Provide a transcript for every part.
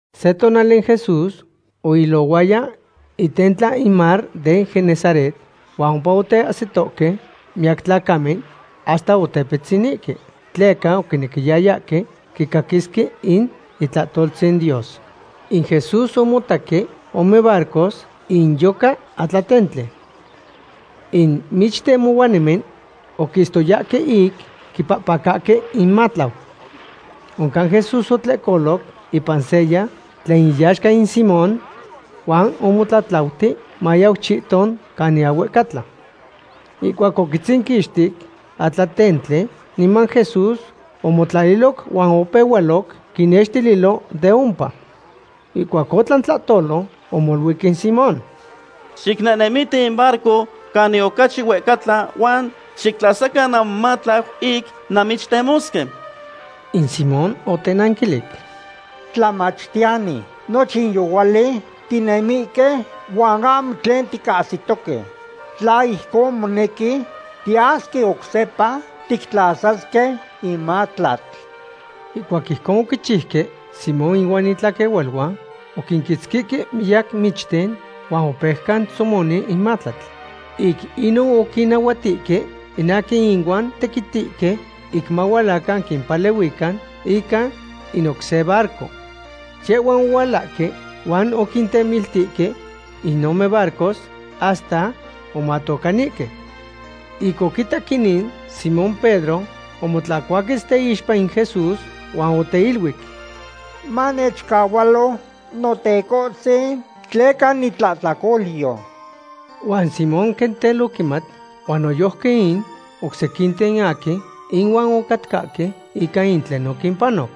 Se tonali in Jesús oilohuaya itentla in mar den Genesaret huan ompa oteahsitohque miyac tlacamen, hasta otepitzinihque, tleca oquinequiyayahque quicaquisque in itlahtoltzin Dios. In Jesús omotaque ome barcos inyoca atlatentli. In michtemohuanimen oquistoyahque ic quipacahque inmatlau. Oncan Jesús otlehcoloc ipan seya, tlen iyaxca in Simón, huan omotlatlauti mayau chihton canin ahuehcatla. Ihcuac oquitzinquixti atlatentli, niman Jesús omotlaliloc huan opehualoc quinnextililo de ompa. Ihcuac otlan tlahtolo, omoluic in Simón: ―Xicnehnemiti in barco canin ocachi huehcatla huan xictlasacan namomatlau ic nanmichtemosque. In Simón otenanquilic: ―Tlamachtiyani, nochin yohuali tinemihque huan ahmo tlen ticahsitohque. Tla ijcon monequi, tiyasque oc sepa tictlasasque in matlatl. Ihcuac ijcon oquichiuque, Simón ihuan itlaquehualuan oquinquitzquihque miyac michten huan opeuca tzomoni in matlatl. Ic inon oquinnahuatihque in aquin ihuan tequitihque ic mahualacan quimpalehuican ica in oc se barco. Yehhuan ohualahque huan oquintemiltihque in ome barcos hasta omatocanihque. Ic oquitac inin, Simón Pedro omotlancuaquetz teixpa in Jesús huan oteiluic: ―Manechcahualo, Notecohtzin, tleca nitlahtlacolyo. Huan Simón quen tel oquimat, huan noyojqui in oc sequinten aquin ihuan ocatcahque, ica in tlen oquimpanoc.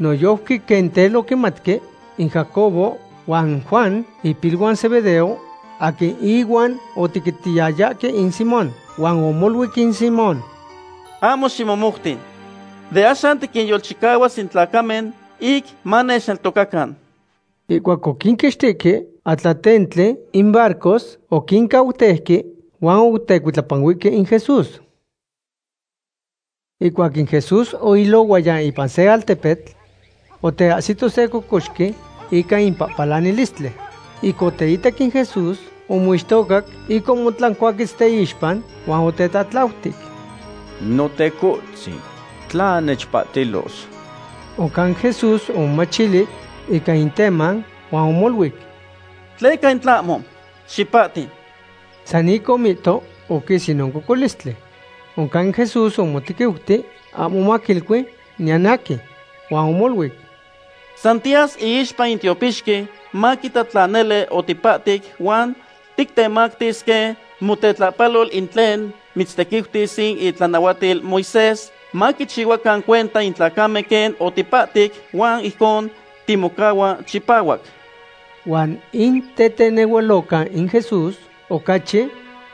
Noyojqui quen tel oquimatque in Jacobo huan Juan, ipiluan Zebedeo, aquin ihuan otequitiyayahque in Simón. Huan omoluic in Simón: ―Ahmo ximomouti. De axan tiquinyolchicahuas in tlacamen ic manechneltocacan. Ihcuac oquinquixtihque atlatentli in barcos, oquincauteuque huan otecuitlapanuihque in Jesús. Ihcuac in Jesús oilohuaya ipan se altepetl, oteahsito se cocoxqui ica in pahpalanilistli. Ic oteitac in Jesús, omixtocac ic omotlancuaquetz teixpa huan otetlatlautic: ―Notecohtzin, tla nechpahtilos. Oncan Jesús omomachili ica in teman huan omoluic: ―Tleca in tlahmo. Xipahti. San ic omihto, oquis inon cocolistli. Oncan Jesús omotequiuti ahmo maquilui niyan aquin. Huan omoluic: ―San tiyas iixpa in tiopixqui maquita tla nele otipahtic huan tictemactis quen motetlahpalol in tlen mitztequiutis in itlanahuatil Moisés, maquichihuacan cuenta in tlacamen quen otipahtic, huan ijcon timocahua chipahuac. Huan in tetenehualoca in Jesús ocachi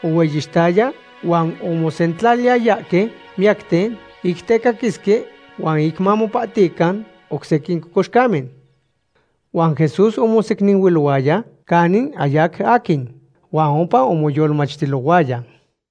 ohueyixtaya huan omosentlaliyayahque miyacten ic tecaquisque huan ic mamopahtican oc sequin cocoxcamen. Huan Jesús omosecninuilohuaya canin ahyac aquin, huan ompa omoyolmachtilohuaya.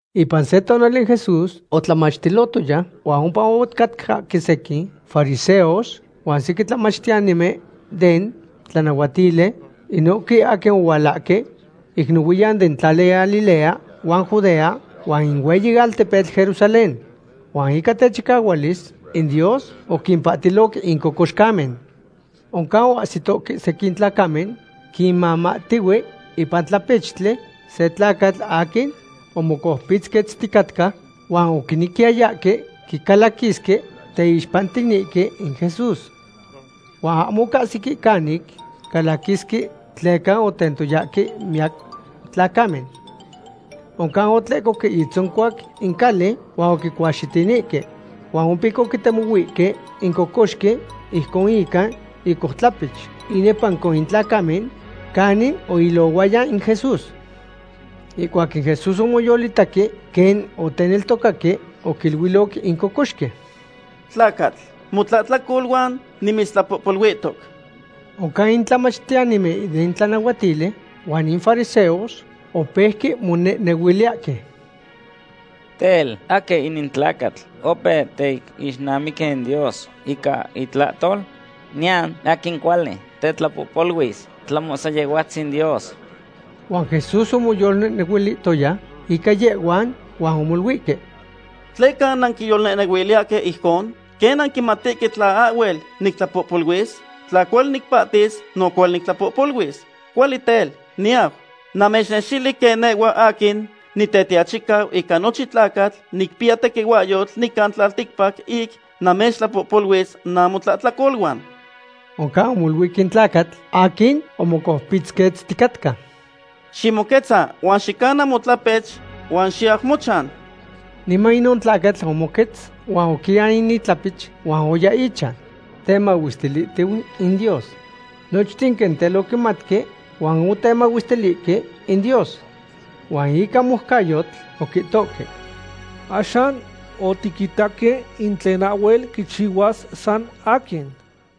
Ipan se tonali Jesús otlamachtilohtoya, huan ompa ocatcahque sequin fariseos huan sequin tlamachtiyanimen den tlanahuatili, inohque aquin ohualahque ic nohuiyan den tlali Galilea huan Judea huan in hueyi altepetl Jerusalén. Huan ica techicahuilis in Dios oquimpahtiloc in cocoxcamen. Oncan oahsitohque sequin tlacamen quimamahtihue ipan tlapechtli se tlacatl aquin omocoupitzquetzticatca, huan oquinequiyayahque quicalaquisque teixpantinihque in Jesús. Huan ahmo ocahsique canic calaquisque tleca otentoyahque miyac tlacamen. Oncan otlehcohque itzoncuac in cali huan oquicuaxitinihque. Huan ompic oquitemohuihque in cocoxqui ijcon ica icoutlapech inepanco in tlacamen canin oilohuaya in Jesús. Ihcuac in Jesús omoyolitaque quen oteneltocaque, oquiluiloc in cocoxqui: ―Tlacatl, motlahtlacoluan nimitztlapohpoluihtoc. Oncan in tlamachtiyanimen den tlanahuatili huan in fariseos opeuque monehnehuiliyahque: “Tel, ¿aquin inin tlacatl opeu teixnamiqui in Dios ica itlahtol? Niyan aquin cuali tetlapohpoluis tlahmo san Yehhuatzin Dios.” Huan Jesús omoyolnehnehuilihtoya ica yehhuan huan omoluihque: ―¿Tleca nanquiyolnehnehuiliyahque ijcon? ¿Quen nanquimatihque tla ahhuel nictlapohpoluis? Tla cuali nicpahtis, no cuali nictlapohpoluis. Cuali tel, niyau namechnextili quen nehhua aquin Nitetiachicau ica nochin tlacatl nicpiya tequihuahyotl nican tlalticpac ic namechtlapohpoluis namotlahtlacoluan. Oncan omoluic in tlacatl aquin omocoupitzquetzticatca: ―Ximoquetza huan xicana motlapech huan xiyau mochan. Niman inon tlacatl omoquetz huan oquian in itlapech huan oya ichan temahuestilihtiu in Dios. Nochten quen tel oquimatque huan otemahuestilihque in Dios. Huan ica moucayotl oquihtohque: ―Axan otiquitaque in tlen ahhuel quichihuas san aquin.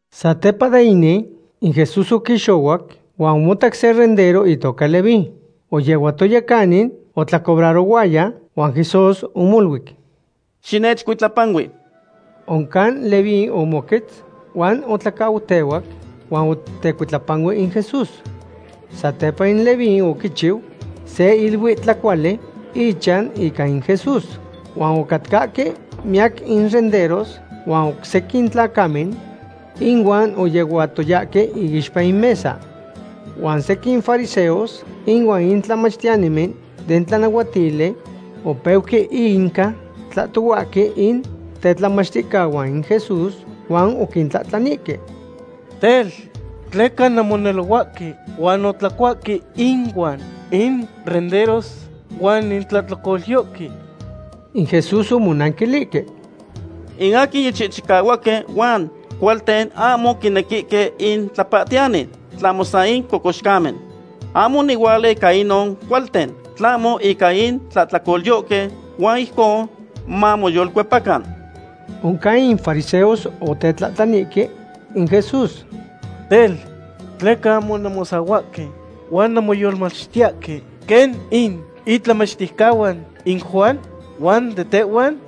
Satepa de inin, in Jesús oquixohuac huan omotac se rendero itoca Leví. Oyehuatoya canin otlacobrarohuaya, huan Jesús omoluic: ―Xinechcuitlapanui. Oncan Leví omoquetz, huan otlacautehuac huan otecuitlapanuic in Jesús. Satepa in Leví oquichiu se iluitlacuali ichan ica in Jesús, huan ocatcahque miyac in renderos huan oc sequin tlacamen inuan oyehuatoyahque iixpa in mesa. Huan sequin fariseos inuan in tlamachtiyanimen den tlanahuatili opeuque inca tlahtohuahque in tetlamachticahuan in Jesús huan oquintlahtlanihque: ―Tel, ¿tleca nanmonelohuahque huan nantlacuahque inuan in renderos huan in tlahtlacolyohque? In Jesús omonanquilihque: ―In aquin yichihchicahuaque huan cualten ahmo quinequihque in tlapahtiyani, tlahmo san in cocoxcamen. Ahmo onihuala ica inon cualten, tlahmo ica in tlahtlacolyohque, huan ijcon mamoyolcuepacan. Oncan in fariseos otetlahtlanihque in Jesús: ―Tel, ¿tleca ahmo nanmosahuahque huan nanmoyolmachtiyahque quen in itlamachticahuan in Juan huan de tehhuan?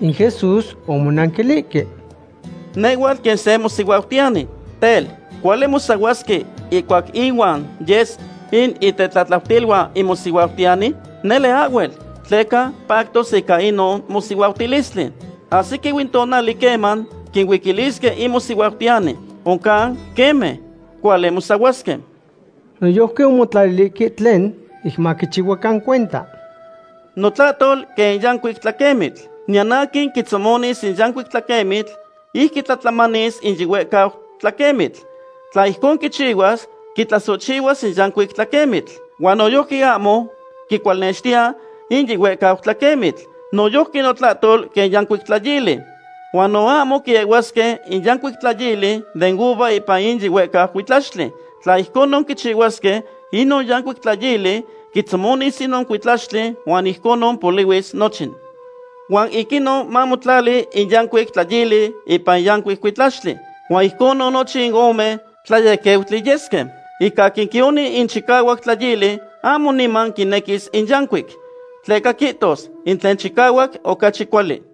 In Jesús omonanquilihque: ―Nehhuatl quen se mosihuautiyani. Tel, ¿cuali mosahuasque ihcuac inuan yes in itetlatlautiluan in mosihuautiyani? Nele ahhuel, tleca pactoque ica inon mosihuautilistli. Ahsiquiu in tonali queman quincuilisque in mosihuautiyani. Oncan queme, cuali mosahuasque. Noyojqui omotlalilihque tlen ic maquichihuacan cuenta: ―Notlahtol quen in yancuic tlaquemitl. Niyan aquin quitzomonis in yancuic tlaquemitl ic quitlatlamanis in yihuehcau tlaquemitl. Tla ijcon quichihuas, quitlasohchihuas in yancuic tlaquemitl. Huan noyojqui ahmo quicualnextiya in yihuehcau tlaquemitl. Noyojqui notlahtol quen yancuic tlayili. Huan no ahmo quiehuasque in yancuic tlayili den uva ipan in yihuehcau cuitlaxtli. Tla ijconon quichihuasque, inon yancuic tlayili quitzomonis inon cuitlaxtli huan ijconon polihuis nochin. Huan ic inon mamotlali in yancuic tlayili ipan in yancuic cuitlaxtli. Huan ijconon nochin in ome tlayequeutli yesque. In aquin quioni in chicahuac tlayili ahmo niman quinequis in yancuic, tleca quihtos: “In tlen chicahuac ocachi cuali.”